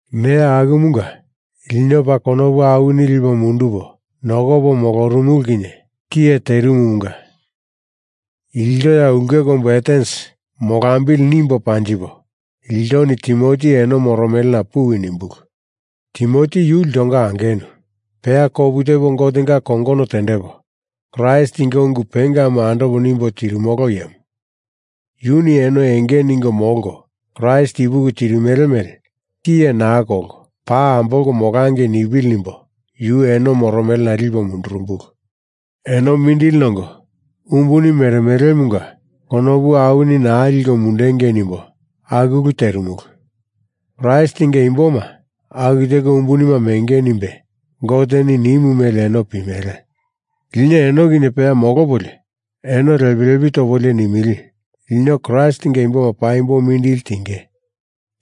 Neya akumunga, lino paa konopu awini lipo mundupo nokopo molorumulu kinye tiye terimumunga ilto ya ulke kombu Atens molambili nimbo panjipo iltoni Timoti eno moromelena puwi nimbulu. Timoti yu iltonga angenu, peya kopu tepo Gotenga kongono tendepo Kraistinga ungu pengamu andopo nimbo tirimolo iyemu. Yuni eno enge ningo molko Kraist ipuki tirimele mele tiye naa kolko paa ambolko molangei nipili nimbo yu eno moromelena lipo mundurumbulu. Eno mindili nongo umbuni meremelemunga konopu awini naa liko mundengei nimbo aku ulu terimulu. Kraistinga imboma aku teko umbunima menge nimbe Goteni nimu mele eno pimele. Lino eno kinye peya molopolio eno lepi lepi topolio nimili, lino Kraistinga imboma paimbo mindili tinge,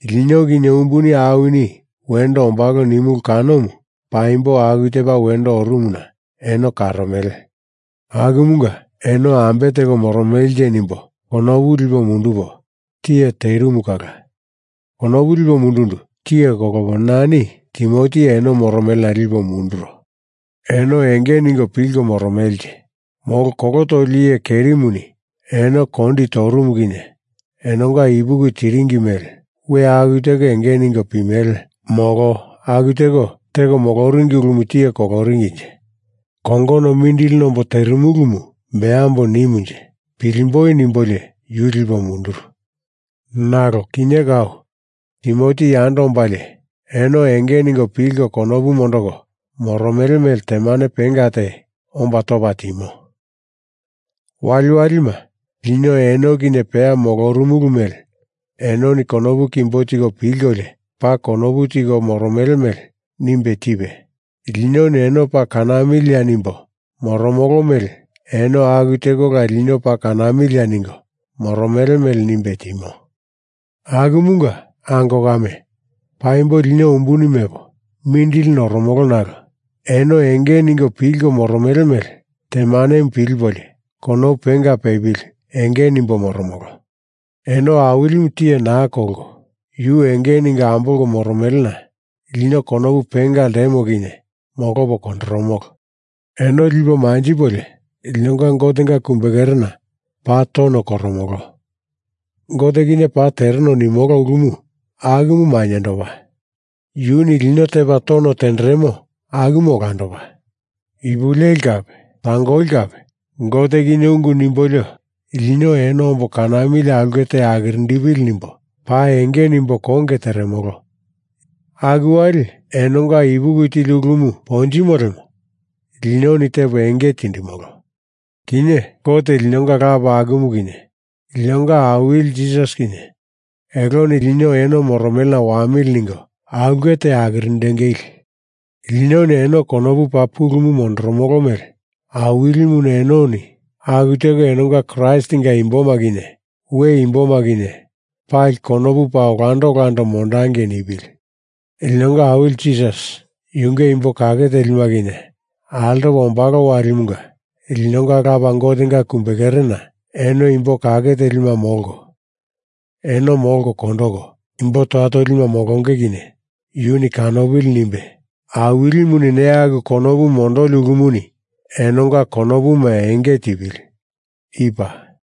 lino kinye umbuni awini wendo ombalo nimulu kanomu paimbo aku tepa wendo orumuna eno karomele. Akumunga eno ambe teko moromelenje nimbo konopu lipo mundupo tiye terimu kala konopu lipo mundundu tiye kolopo nani Timoti eno moromelena lipo munduro. Eno enge ningo pilko moromelenje, molo kolo toli iye kerimuni eno kondi torumu kinye enonga ipuki tiringi mele we aku teko enge ningo pimele, molo aku teko teko moloringi ulumu tiye koloringinje, kongono mindili nombo terimulumu beambo nimunje, pilimboi nimbolio yu lipo munduru. Nalo kinye kau Timoti yando ombalie eno enge ningo pilko konopu mondoko moromele mele temane penga te omba topa timo. Waliwalima lino eno kinye peya molorumulu mele enoni konopu kimbo tiko pilkolio paa konopu tiko moromele mele nimbe tipe, linoni eno paa kanamiliya nimbo moromolo mele eno aku tekola lino paa kanamiliya ningo moromele mele nimbe timo. Akumunga, ango kame, paimbo lino umbuni mepo mindili noromolo nalo eno enge ningo pilko moromele mele temanemu pilipolio konopu penga pepili enge nimbo moromolo. Eno Awilimu tiye naa kolko yu enge ningo ambolko moromelena lino konopu penga ltemo kinye molopo kondoromolo. Eno lipo manjipolio linonga Gotenga kumbekerena paa tono koromolo. Gote kinye pa tereno nimolo ulumu akumu maindopa. Yuni lino tepa tono tenderemo akumu olandopa. Ipu leli kape tangoli kape Gote kinye ungu nimbolio lino eno ombo kanamili aulke te akirindepili nimbo paa enge nimbo konge teremolo. Aku wali enonga ipuki tili ulumu ponjimo lemo linoni tepo enge tindimolo. Kinye Gote linonga Lapa akumu kinye linonga Awili Jisas kinye eloni lino eno moromelena wamili ningo aulke te akirindengili. Linoni eno konopu paa pulumu mondoromolo mele Awilimuni enoni aku teko enonga Kraistinga imboma kinye we imboma kinye pali konopu paa olando olando mondangei nipili. Linonga Awili Jisas yunge imbo kake telima kinye altopa ombalo walimunga linonga Lapa Gotenga kumbekerena eno imbo kake telima molko eno molko kondoko imbo toya tolima molonge kinye yuni kanopili nimbe Awilimuni neya aku konopu mondoli ulumuni enonga konopuma enge tipili. I paa.